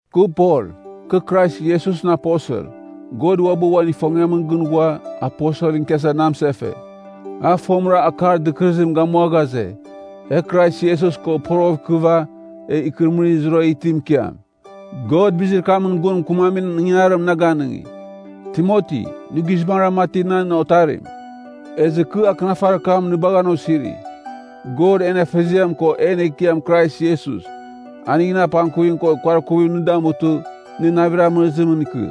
Kɨ Pol, kɨ Krais Iesusɨn aposel. God uabɨ uan ifongiamɨn gɨn ghua, aposelɨn ikiasa na mɨsefe. A fomɨra akar dɨkɨrɨzim gamua ghaze, e Krais Iesus ko poroghɨv ikɨva, egh ikɨrɨmɨrir zurara itimɨn ikiam. God bizir kamɨn gun mɨkɨmamin ingangarim na ganɨngi. Timoti, nɨ guizbangɨra mati nan otarim, ezɨ kɨ akɨnafarir kam nɨ bagha an osiri. God en Afeziam ko en Ekiam Krais Iesus, aningɨn apangkuvim ko kuarkuvim nɨ damutɨ, nɨ navir amɨrɨzimɨn ikɨ.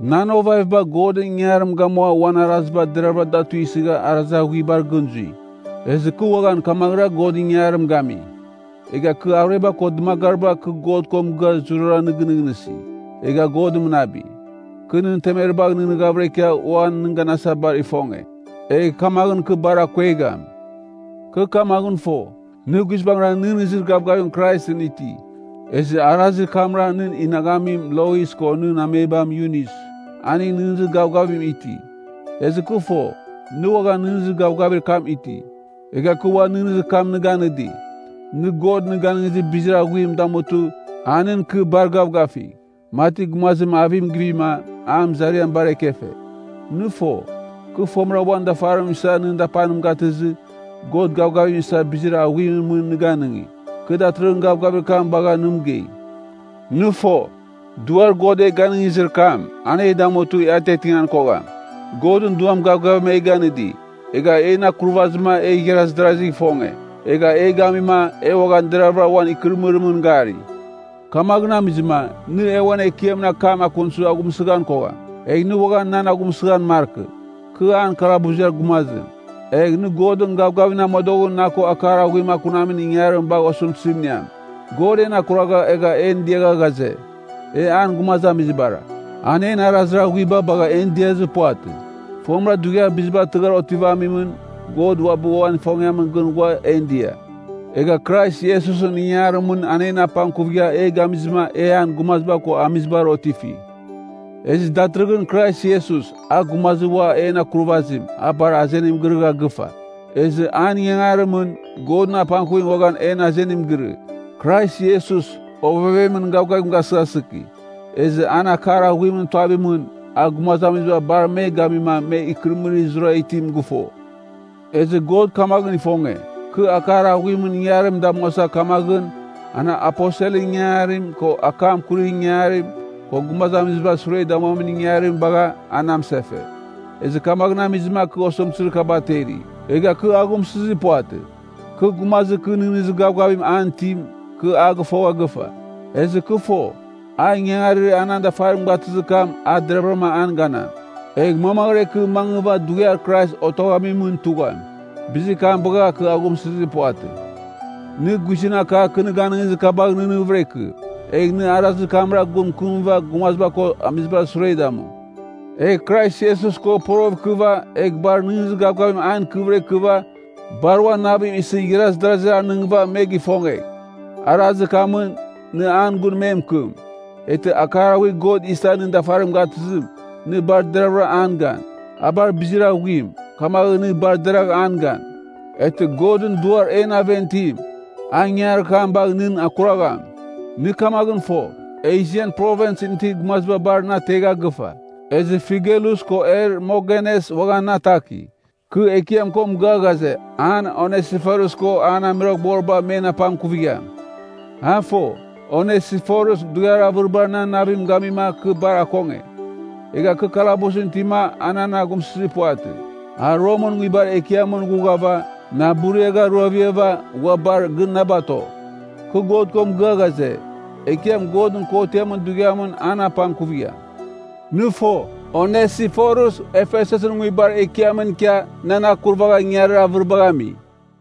Nan ovaviba Godɨn ingangarim gamua uan araziba deravɨra da tuisɨgha arazir aghuibar gɨn zui. Ezɨ kɨ uaghan kamaghɨra Godɨn ingangarim gami. Egha kɨ arueba ko dɨmagaribar kɨ God ko mɨgɨa zurara nɨ gɨnɨghnɨsi, egha God mɨnabi. Kɨ nɨn temeribagh nɨghnɨghavɨra ikia ua nɨn ganasa bar ifonge, egh kamaghɨn kɨ bar akuegham. Kɨ kamaghɨn fo, nɨ guizbangɨra nɨghnɨzir gavgavim Kraisɨn iti. Ezɨ arazir kamra nɨn inaghamim, Lois ko nɨn amebam Yunis, aning nɨghnɨzir gavgavim iti. Ezɨ kɨ fo, nɨ uaghan nɨghnɨzir gavgavir kam iti. Egha kɨ ua nɨghnɨzir kam nɨ ganɨdi, nɨ God nɨ ganɨngizir bizir aghuim damutɨ, a nɨn ikɨ bar gavgafigh, mati gumazim avim givima, an mɨzariam bar ekefe. Nɨ fo, kɨ fomɨra uan dafarim isa nɨn dapanim gatɨzɨ, God gavgavim isa bizir aghuimɨn mɨn nɨ ganɨngi. Kɨ datɨrɨghɨn gavgavir kam bagha nɨ mɨgei. Nɨ fo, Duar God e ganɨngizir kam, an e damutɨ e atiatingan kogham. Godɨn Duam gavgavim e ganɨdi, egha en akurvazima e igharaz darazigh ifonge. Egha e gamima, e uaghan deravɨra uan ikɨrɨmɨrimɨn gari. Kamaghɨn amizɨma, nɨ e uan Ekiamɨn akam akunsɨ aghumsɨghan kogham. Egh nɨ uaghan nan aghumsɨghan markɨ, kɨ an kalabuziar gumazim. Egh, nɨ Godɨn gavgavimɨn amodoghɨn na ko akar aghuim akunamin ingangarim bagh osɨmtɨzim iniam. God en akuragha egha en diagha ghaze, e an gumazamizibara. An en arazir aghuiba bagha en diazir puvatɨ. Fomɨra dughiar biziba tɨghar otivamimɨn, God uabɨ uan ifongiamɨn gɨn ghua en dia. Egha Krais Iesusɨn ingarimɨn a en apangkuvigha e gamizɨma e an gumaziba ko amizibar otifi. Ezɨ datɨrɨghɨn Krais Iesus, a Gumazir ua en Akurvazim, a bar azenim girɨgha gɨfa. Ezɨ an ingangarimɨn, Godɨn apangkuvim uaghan en azenim girɨ. Krais Iesus, ovevemɨn gavgavim gasɨghasɨki. Ezɨ an akar aghuimɨn tuavimɨn, a gumazamiziba bar me gamima me ikɨrɨmɨrir zurara itim gɨfo. Ezɨ God kamaghɨn ifonge, kɨ akar aghuimɨn ingangarim damuasa. Kamaghɨn, an aposelɨn ingangarim, ko akam akurir ingangarim, ko gumazamizibar sure damuamin ingangarim bagha, a na mɨsefe. Ezɨ kamaghɨn amizɨma kɨ osɨmtɨzir kaba ateri, egha kɨ aghumsɨzir puvatɨ. Kɨ, gumazir kɨ nɨghnɨzir gavgavim an itim, kɨ a gɨfogha gɨfa. Ezɨ kɨ fo, a ingangarir a nan dafarim gatɨzir kam a deraghvɨram an ganam, egh mamaghɨra ikɨ mangɨva dughiar Krais otoghamimɨn tugham. Bizir kam bagha kɨ aghumsɨzir puvatɨ. Nɨ guizɨn akar kɨ nɨ ganɨngizir kabagh nɨghnɨghvɨra ikɨ, egh nɨ arazir kamra gun mɨkɨmɨva gumaziba ko amizibar sure damu. Egh Krais Iesus ko porogh ikɨva, egh bar nɨghnɨzir gavgavim an ikɨvɨra ikɨva, bar uan navim isɨ igharaz darazir anɨngɨva me gifongegh. Arazir kamɨn, nɨ an gun me mɨkɨm. Eghtɨ akar aghuir God isa nɨn dafarim gatɨzim, nɨ bar deravɨra an gan. A bar bizir aghuim, kamaghɨn nɨ bar deragh an gan. Eghtɨ Godɨn Duar en aven itim, a ingangarir kam bagh nɨn akuragham. Nɨ kamaghɨn fo, Esian Provinsɨn gumaziba bar na ategha gɨfa. Ezɨ Figelus ko Hermogenes uaghan na ataki. Kɨ Ekiam ko mɨgɨa ghaze, an Onesiforus ko an amuiroghboriba men apangkuvigham. A fo, Onesiforus dughiar avɨriba nan navim gamima kɨ bar akonge. Egha kɨ kalabusɨn itima a nan aghumsɨzir puvatɨ. A Romɨn nguibar ekiamɨn ghughava, na buriagharuaviava, ghua bar gɨn na bato. Kɨ God ko mɨgɨa ghaze, Ekiam Godɨn Kotiamɨn Dughiamɨn an apangkuvigham. Nɨ fo, Onesiforus Efesusɨn nguibar ekiamɨn ikia nan akurvagha ingangarir avɨribagh ami.